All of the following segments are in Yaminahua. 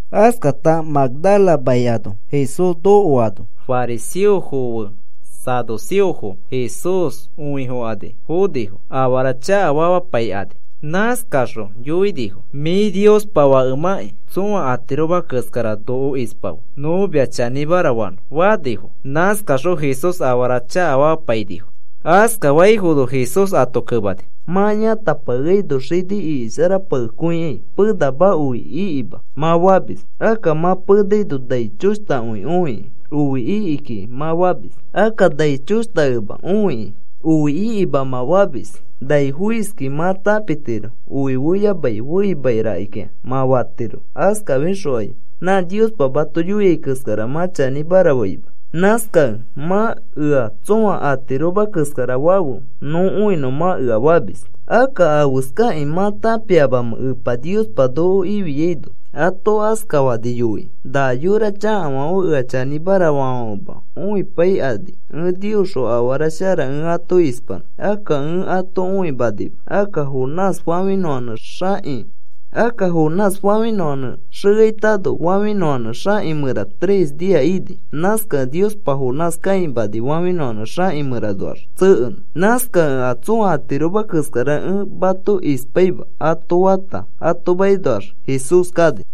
Askata Magdala mai ano Jesús nokoano fariseo fe saduceofo Jesús õifokani fonifo afara chakafamapaikani. Nãskakaxõ yoinifo: “Mĩ Niospa Fakemãkĩ tsõa atiroma keskara noko ispafe nõ mia chanĩmara fanõ,” fanifo. Nãskakaxõ Jesús afara chakafamapainifo. Askafaifono Jesús ato kemani: “Mã yãtapakeaino xini iki sharapakekõikai, ‘Penama oi ikima,’ mã famis. Akka mã penaino nai choshtakõi õikĩ, ‘Oi iki kiki,’ mã famis. Akka nai choshtakẽma õikĩ, ‘Oi ikima,’ mã famis. Nai foiskĩ mã tãpitiro oi feyamai feima rakikĩa mã fatiro. Askafixokai nã Niospa mato yoiai keskara mã chanĩmara faima. Nãskakẽ mã ea tsõa atiroma keskara fafe, nõ õinõ mã ea famis. Akka, ¿afeskakĩ mã tãpiamamẽ Epa Niospa noko ikĩfiano?” ato askafani yoikĩ. “Na yora chakafãfe ea chanĩmara faafãfema õipaikani ẽ Niosxõ afara shara ẽ ato ispanõ. Akka ẽ ato õimanima. Akka Jonás fafĩnõfãnẽ xeaitano fafĩnõfãnẽ xaki mẽra tres nia ini. Nãskakẽ Niospa Jonás kãimani fafĩnõfãnẽ xãki mẽranoax tsekeinõ. Nãskakẽ a tsõa atiroma keskara ẽ mato ispaima,” ato fata ato makinoax Jesús kani.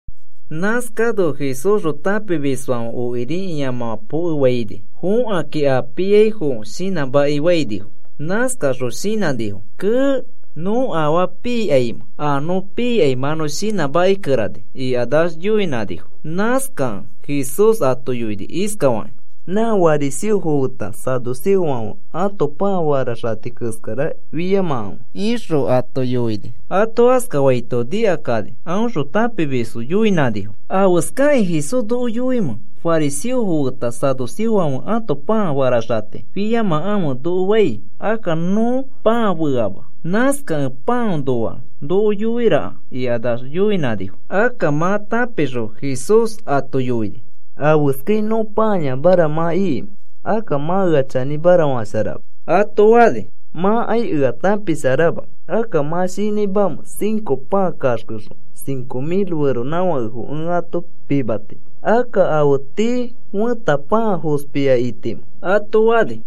Nãskano Jesúsxõ tãpimisfãfe okiri ĩamãfã pokefaini fõkakĩ a pii foaifo shinãmakifainifo. Nãskakaxõ shinãnifo: “Kee, ¿nõ afaa piikaimẽ? A nõ piikai mã nõ shinãmakikerani,” ikanax yoinãnifo. Nãskakẽ Jesús ato yoini iskafakĩ: “Nã fariseofo feta saduceofãfe ãto pãa faraxati keskara fiyamakãfe,” ixõ ato yoini. Ato askafaito nikakani aõxõ tãpimisfo yoinãnifo: “¿Afeskakĩ Jesús noko yoimẽ fariseofo feta saduceofãfe ãto pãa faraxati fiyamakãfe noko fai? Akka nõ pãa feama. Nãskakẽ pãanoa noko yoiraka,” ikax yoinãnifo. Akka mã tãpixõ Jesús ato yoini: “¿Afeskai nõ pãayamara mã ikimẽ? Akka mã ea chanĩmara fasharama,” ato fani. “Mãkai ea tãpisharama. Akka, ¿mã shinãimamẽ cinco pãa kaxkexõ cinco mil feronãfakefo ẽ ato pimati? Akka, ¿afe tii fẽta pãa fospia ikitamẽ?” ato fani.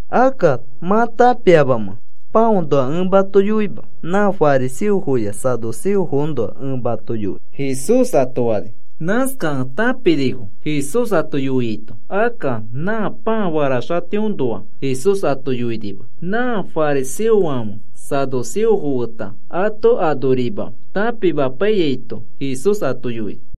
Akka, ¿mã tãpiamamẽ pãanoa ẽ mato yoima? Nã fariseofoya saduceofoõnoa ẽ mato yoi,” Jesús ato fani. Nãskakẽ tãpinifo Jesús ato yoiaito. Akka nã pãa faraxitiõnoa Jesús ato yoinima. Nã fariseofãfe saduceofo feta ato anorima tãpimapaiyaito Jesús ato yoini.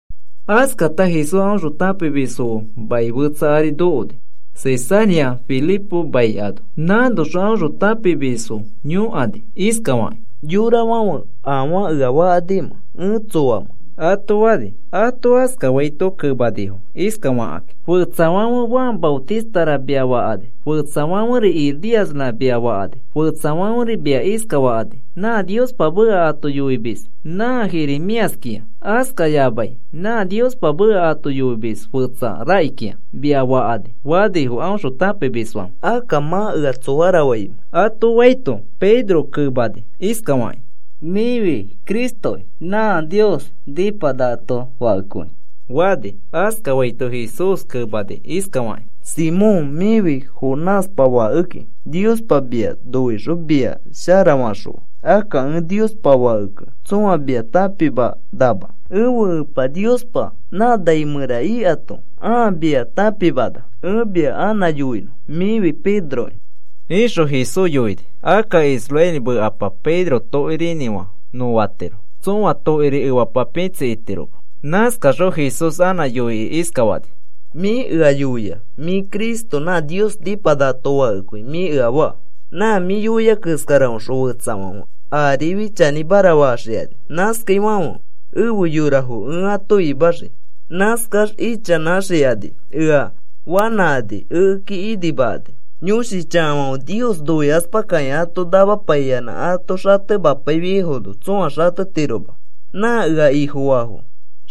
Askata Jesús aõxõ tãpimisfo fe mai fetsa ari nokoni, Cesarea Filipo mai ano. Nãnoxõ aõxõ tãpimisfo yõkani iskafakĩ: “Yorafãfe, ¿afaa ea fakanimẽ ẽ tsoamẽ?” ato fani. Ato askafaito kemanifo iskafakakĩ: “Fetsafãfe, ‘Juan Maotistara’ mia fakani. Fetsafãferi, ‘Elíasra’ mia fakani. Fetsafãferi mia iskafakani: ‘Nã Niospa meka ato yoimis nã Jeremíaskĩa, askayamai nã Niospa meka ato yoimis fetsa rakikĩa,’ mia fakani,” fanifo aõxõ tãpimisfãfe. “Akka, ¿mã, ea tsoara faimẽ?” ato faito, Pedro kemani iskafakĩ: “Mĩfi Cristoki, nã Nios nĩpanakato Fakekõi,” fani. Askafaito Jesús kemani iskafakĩ: “Simón, mĩfi Jonáspa fakeki. Niospa mia noixõ mia sharafaxõa. Akka ẽ Niospa Fakekẽ tsõa mia tãpimanama. Ẽfe Epa Niospa nã nai mẽra ikato ãa mia tãpimana. Ẽ mia anã yoinõ. Mĩfi Pedroki,” ixõ Jesús yoini. Akka israeli mekapa Pedro Tokirinĩfã nõ fatiro. Tsõa tokiri efapa pĩtsi itiroma. Nãskaxõ Jesús anã yoikĩ iskafani: “Mĩ ea yoia: ‘Mĩ Cristo, nã Nios nĩpanakato Fakekõi,’ mĩ ea faa. Nã mĩ yoia keskaraõxõ fetsafãfe arifi chanĩmara faxikani. Nãskaifãfe efe yorafo ẽ ato imaxii. Nãskax ichanãxikani ea fanãkani ekeki inimakani. Yõshi chakafãfe Nios noikaspakakĩ ato namapayanã ato xatemapaifiaifono tsoa xatetiroma. Nã ea Ifofaafo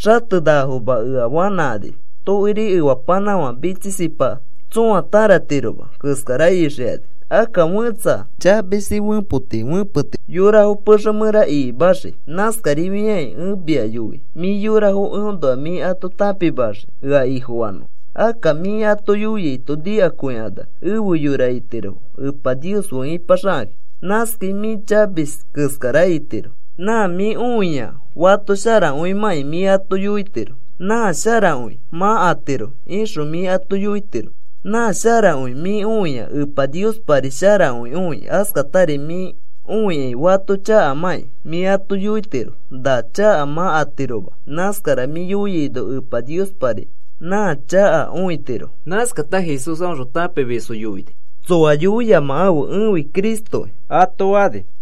xatenakafoma ea fanãkani. Tokiri efapanãfã pĩtsikiki tsõa tararatiroma keskara ixikani. Akka fẽtsa chamisi fepoti fẽpetiro yorafo pexe mẽra ikimaxikĩ. Nãskarifiakĩ ẽ mia yoi mĩ yorafo eõnoa mĩ ato tãpimaxii ea Ifofanõfo. Akka mĩ ato yoiaito nikakõikanax efe yora itirofo Epa Nios fe ipaxakakĩ. Nãskai mĩ chamis keskara itiro. Nã mĩ õiai fato sharakõimãkĩ mĩ ato yoitiro: ‘Nã sharakõi mã atiro,’ ixõ mĩ ato yoitiro. Nã sharakõi mĩ õiai, Epa Niospari sharakõi õi. Askatari mĩ õikai fato chakamakĩ, mĩ ato yoitiro: ‘Na chaka mã atiroma.’ Nãskara mĩ yoiaino, Epa Niospari nã chaka õitiro.” Nãskata Jesús aõxõ tãpimisfo yoini: “Tsoa yoiyamakãfe ẽfi Cristokĩ,” ato fani.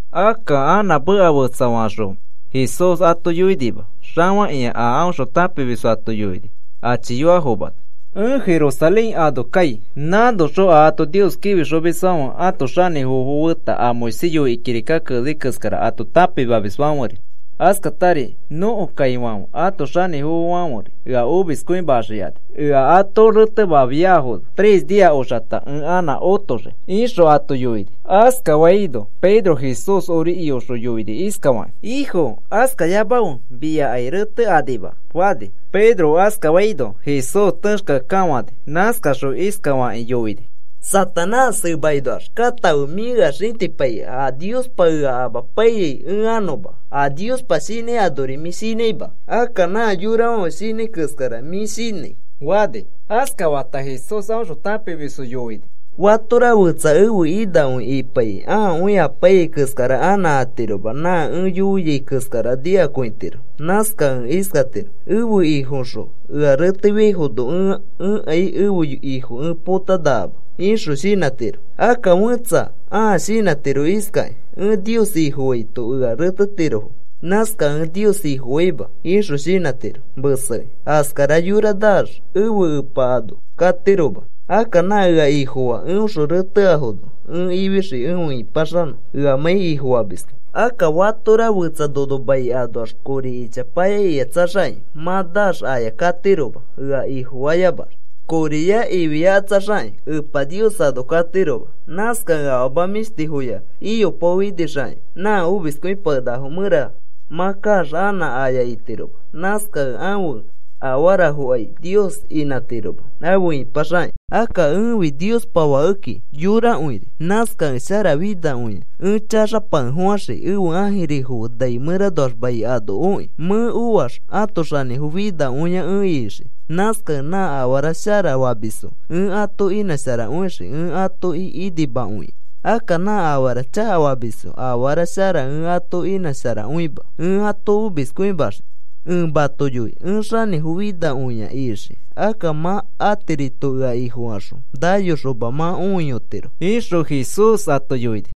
Akka anã meka fetsafaxõ Jesús ato yoinima. Xafakĩakõi a aõxõ tãpimisfo ato yoini achiyoafomano: “Ẽ Jerusalén ano kai. Nãnoxõ a ato Nios kĩfixomisfãfe ãto xanĩfofo feta a Moisés yoikĩ kirika keneni keskara ato tãpimamisfãferi, askatari nõko kaifãfe ãto xanĩfofofãferi ea omiskõimaxikani. Ea ato retemafiafono, tres nia oxata ẽ anã otoxii,” ixõ ato yoini. Askafaino Pedro Jesús ori iyoxõ yoini iskafakĩ: “Ifo, askayamafe. Miakai retekanima kiki,” fani. Pedro askafaino Jesús texkeakekafãni. Nãskaxõ iskafakĩ yoini: “Satanás, emakinoax katãfe. Mĩ ea xĩtipaikai a Niospa ea amapaiyai ẽ anõma. A Niospa shinãi anori mĩ shinãima. Akka nã yorafãfe shinãi keskara mĩ shinãi,” fani. Askafata Jesús aõxõ tãpimisfo yoini: “Fatora fetsa ẽfe inakõi ipaikĩ ãakõi apaiyai keskara anã atiroma. Nã ẽ yoiai keskara nikakõitiro. Nãskakẽ iskatiro: ‘Ẽfe Ifoxõ ea retefiaifono ẽkai ẽfe Ifo ẽ potapakenakama,’ ixõ shinãtiro. Akka fẽtsa ãa shinãtiro iskakĩ: ‘Ẽ Nios Ifofaito ea retetirofo. Nãskakẽ ẽ Nios Ifofaima,’ ixõ shinãtiro mesekĩ. Askara yora naax ẽfe Epa ano katiroma. Akka nã ea Ifofaa, eõxõ reteafono ẽ ifixii efe ĩpaxanõ eamãi Ifofamiskẽ. Akka fatora fetsa nono mai anoax kori ichapaya ikatsaxakĩ mã naax aya katiroma. Ea Ifofayamax koriya ifiyakatsaxakĩ Epa Nios ano katiroma. Nãskakẽ afama mĩshtifoya iyopaofinixakĩ nã omiskõipakenakafo mẽra mã kaax anã aya itiroma. Nãskakẽ ãfe afaraforikai Nios inãtiroma afe ĩpaxakĩ. Akka ẽfi Niospa Fakekĩ yorakõiri. Nãskakẽ sharafinakõia chaxapakefofãxii ẽfe ãjirifo fe nai mẽranoax mai ano okĩ. Mẽ oax ẽ ãto xanĩfo finakõia ẽ ixii. Nãskakẽ nã afara shara famisfo ẽ ato inãsharakõixii ẽ atoki inimakõikĩ. Akka nã afara chakafamisfo afara shara ẽ ato inãsharakõima. Ẽ ato omiskõimaxii. Ẽ mato yoi ẽ xanĩfo finakõia ixii. Akka mã atirito ea Ifofaxõ nayoxoma mã õiyotiro,” ixõ Jesús ato yoini.